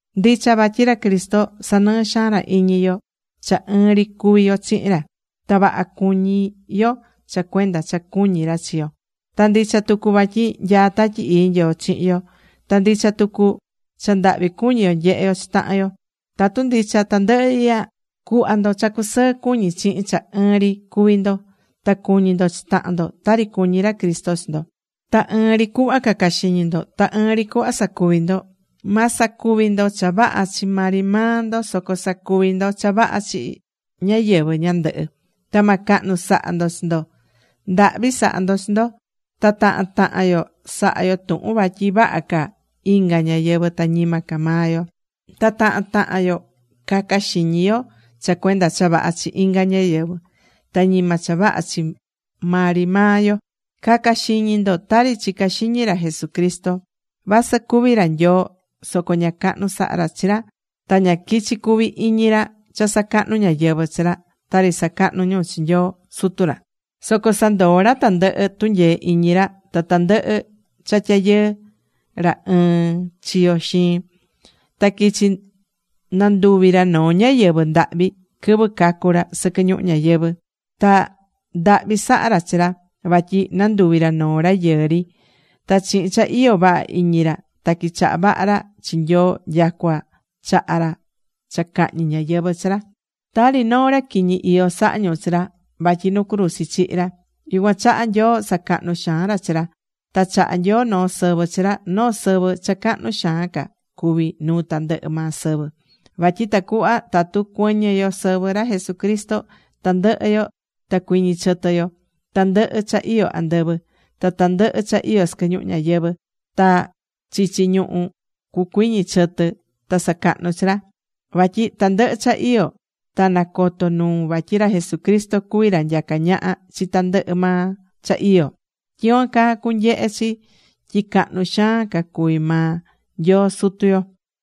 Ndicha vatyi ra Cristo sanɨɨ́ xaan ra iñi yo cha ɨɨn ri cuví yo chihin ra. Ta vaha cuñí yo cha cuenda cha cuñí ra chi yo. Ta ndicha tucu vatyi nyaá Tatyi Ii Nyoo chihin yo. Ta ndicha tucu cha ndahvi cuñí yo nyehé yo chi tahan yo. Tatu ndicha tandɨhɨ ihya, cu̱hva ndo cha cusɨɨ cuñí chihin cha ɨɨn ri cuví ndo. Ta cu̱ñi ndo chi tahan ndo tari cuñí ra Cristo chi ndo. Ta ɨɨn ri cuhva caca xiñi ndo. Ta ɨɨn ri cuhva sacuvi ndo. Ma sacuvi ndo cha vaha chi maa ri maa ndo, soco sa̱cuvi ndo cha vaha chi ñáyɨvɨ ñandɨhɨ. Ta ma cahnu saha ndo chi ndo. Ndahvi sa̱ha yo chi yo. Ta tahan tahan yo sa̱ha yo tuhun vatyi vaha ca inga ñáyɨvɨ ta ñima ca maa yo. Ta tahan tahan yo caca xiñi yo cha cuenda cha vaha chi inga ñáyɨvɨ, ta ñima cha vaha chi maa ri maa yo. Ca̱ca xiñi ndo tari chicá xiñi ra Jesucristo. Vasɨ cuví ra Nyoo, soco ña cahnu saha̱ ra chi ra ta ña quichi̱ cuvi iñi ra cha sacahnu̱ ñáyɨvɨ chi ra, tari sacahnú ñu chi Nyoo Sutu ra. Soco sandoo̱ ra tandɨhɨ tunyee iñi ra ta tandɨhɨ cha tyayɨɨ ra ɨɨn chiyo xiin. Ta quichi̱ nanduvi̱ ra noo ñáyɨvɨ ndahvi quɨvɨ cacu̱ ra sɨquɨ ñuhu ñayɨvɨ̱. Ta ndahvi saha̱ ra chi ra, vatyi nanduvi̱ ra noo rayɨɨ ri. Ta chihin cha iyó vaha iñi ra ta quichaha̱ vaha ra chi Nyoo nyacua chaha̱ ra cha cahñi ñáyɨvɨ chi ra. Tari noo ra quiñi iyó saha̱ ñu chi ra, vatyi nu cruzi chihi̱ ra. Yucuan chaha Nyoo sacahnú xaan ra chi ra. Ta chahá Nyoo noo sɨvɨ chi ra, noo sɨvɨ cha cahnu xaan ca cuví nuu tandɨhɨ maa sɨvɨ. Vatyi tacuhva tatu cuɨñɨ yo sɨvɨ ra Jesucristo, tandɨhɨ yo ta cuiñi chɨtɨ yo. tandɨhɨ cha iyó andɨvɨ. Ta tandɨhɨ cha iyó sɨquɨ ñuhu ñayɨvɨ̱, ta chichi ñuhú, cucuiñi chɨtɨ ta sacahnu chi ra. Vatyi tandɨhɨ cha iyó ta nacoto nuu vatyi ra Jesucristo cuví ra nyacá ñaha chi tandɨhɨ maa cha iyó. Tyicuan caa cunyehe chi tyi cahnu xaan ca cuví maa Nyoo Sutu yo.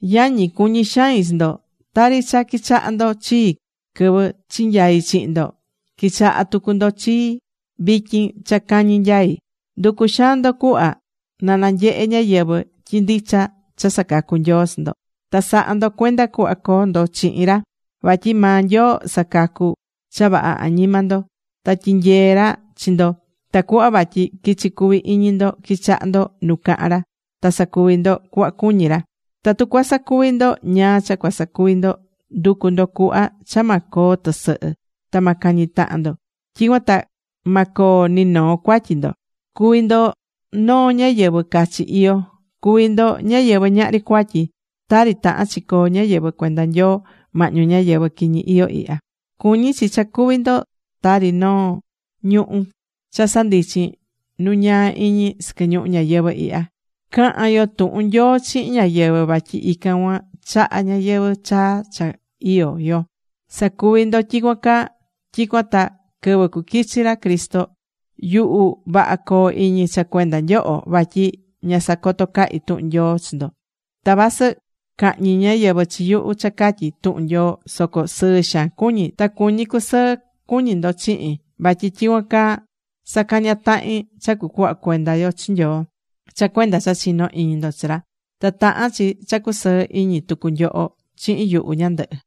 Yañi, cuñí xain chi ndo. Ta tari cha quichaha̱ ndo chii quɨvɨ chinyai chihin ndo, qui̱chaha tucu ndo chii vityin cha cañi nyaí. Ndu̱cu xaan ndo cuhva na nyehe ñáyɨvɨ tyi ndicha cha sacacú Nyoo chi ndo. Ta sa̱ha ndo cuenda cuhva coo ndo chihin ra. Vatyi maa Nyoo sacacu̱ cha vaha añima ndo. Ta tyinyeé ra chi ndo tacuhva vatyi quichi cuvi iñi ndo quichaha ndo nu cahán ra, ta sacuvi ndo cuhva cuñí ra. Tatu cuasacuvi ndo ñáá cha cuasacuvi ndo, ndu̱cu ndo cuhva cha ma coo tɨsɨhɨ, ta ma cañi tahan ndo. Tyicuan ta ma coo ni noo cuatyi ndo. Cu̱vi ndo noo ñáyɨvɨ cachi iyó, cu̱vi ndo ñáyɨvɨ ñahri cuatyi, tari tahán chi coo ñáyɨvɨ cuenda Nyoo mahñu ñáyɨvɨ quiñi iyó ihya. Cuñí chi cha cuví ndo tari noo ñuhu̱ cha sandichín nu ñaa iñi sɨquɨ ñuhu ñayɨvɨ̱ ihya. Ca̱han yo tuhun Nyoo chihin ñáyɨvɨ vatyi ican cuan chahá ñayɨvɨ̱ chaa cha iyó yo. Sa̱cuvi ndo tyicuan caa, tyicuan ta quɨvɨ cuquichi ra Cristo, yuhu vaha coo iñi cha cuenda nyoho, vatyi ña sacoto̱ cahi tuhun Nyoo chi ndo. Ta vasɨ cahñi ñáyɨvɨ chi yuhu, cha catyi tuhun Nyoo, soco sɨɨ xaan cuñí ta cuñí cusɨɨ cuñi ndo chihin vatyi tyicuan caa sacañá tahin cha cucuhva cuenda yo chi Nyoo, cha cuenda cha chinó iñi ndo chi ra. Ta tahán chi cha cusɨɨ iñi tucu nyoho chihin yuhu ñandɨhɨ.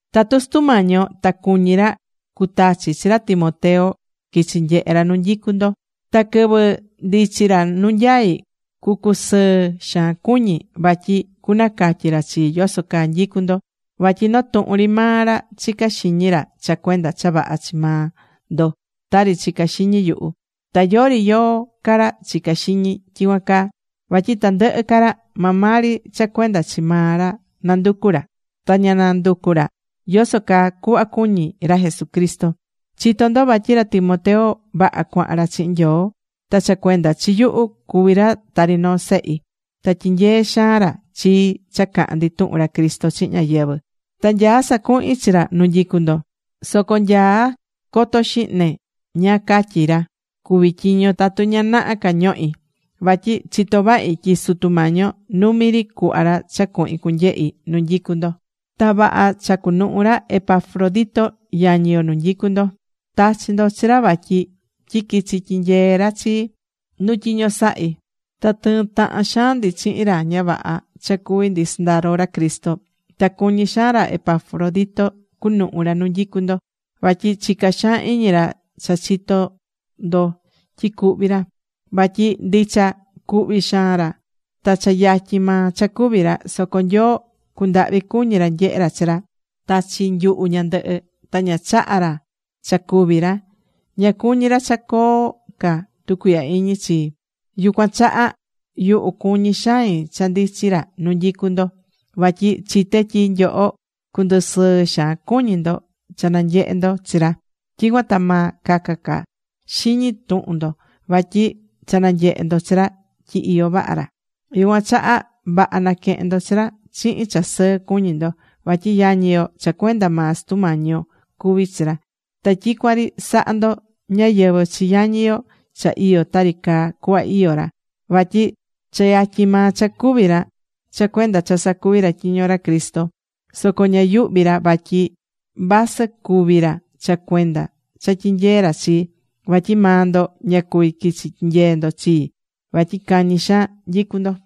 Tatu Sutu Mañi yo ta cuñí ra cutachi chi ra Timoteo quichi nyehe ra nu nyicú ndo. Ta quɨvɨ ndichi ra nu nyaí cucusɨɨ xaan cuñi. Vatyi cunacatyi ra chii yoso caa nyicú ndo. Vatyi noo tuhun ri maa ra chicá xiñi ra cha cuenda cha vaha chi maa ndo tari chicá xiñi yuhu. Ta yori yóó ca ra chicá xiñi tyicuan caa. Vatyi tandɨhɨ ca ra, maa maa ri cha cuenda chi maa ra nanducú ra. Ta ña nanducú ra yoso caa cuhva cuñí ra Jesucristo. Chitó ndo vatyi ra Timoteo, vaha cuahan ra chihin Nyoo, ta cha cuenda chi yuhu cuví ra tari noo sehi. Ta tyinyeé xaan ra chii cha cahán ndi tuhun ra Cristo chihin ñáyɨvɨ. Ta nyaá sacuhin chi ra nu nyicú ndo. Soco nya coto xihne ñáá catyi ra cuví tyiño, tatu ña naha ca ñohí. Vatyi chitó vahi tyi Sutu Mañi yo numi ri cuhva ra cha cuhin cunyehi nu nyicú ndo. Ta vaha cha cunuhu ra Epafrodito yañi yo nu nyicu ndo. Tachi̱ ndo chi ra vatyi quichi tyinyee ra chii nu tyiño sahí. Ta tɨɨ́n tahan xaan ndi chihin ra ña vaha cha cuví ndi sɨndaro ra Cristo. Ta cuñí xaan ra Epafrodito cunuhu ra nu nyicú ndo, vatyi chicá xaan xiñi ra cha chitó ndo tyi cuhvi̱ ra. Vatyi ndicha cuhvi̱ xaan ra ta cha yatyin maa cha cúvi ra. Soco Nyoo cundahvi cuñi̱ ra nyehe chi ra, ta chi yuhu ñandɨhɨ. Ta ña chaha̱ ra cha cúvi ra. Ña cuñí ra cha coo ca tucuihya iñi chii. Yucuan chaha yuhu cuñí xain cha ndichi ra nu nyicú ndo. Vatyi chité tyi nyoho cundusɨɨ xaan cuñi ndo cha nanyehe ndo chi ra. Tyicuan ta ma caca ca xiñi tuhun ndo. Vatyi cha nanyehé ndo chi ra tyi iyó vaha ra. Yucuan chaha vaha na̱quehen ndo chi ra chihin cha sɨɨ cuñí ndo, vatyi yañi yo cha cuenda maa Sutu Mañi yo cuví chi ra. Ta tyicuan ri sa̱ha ndo ñáyɨvɨ chi yañi yo cha iyó tari caa cuhva iyó ra. Vatyi cha yatyin maa cha cúvi ra cha cuenda cha sacuví ra tyiño ra Cristo. Soco ña yuhví ra vasɨ cúvi ra cha cuenda cha tyinyeé ra chii. Vatyi maa ndo ña cuví quichi tyinyee ndo chii vatyi cañi xaan nyicu ndo.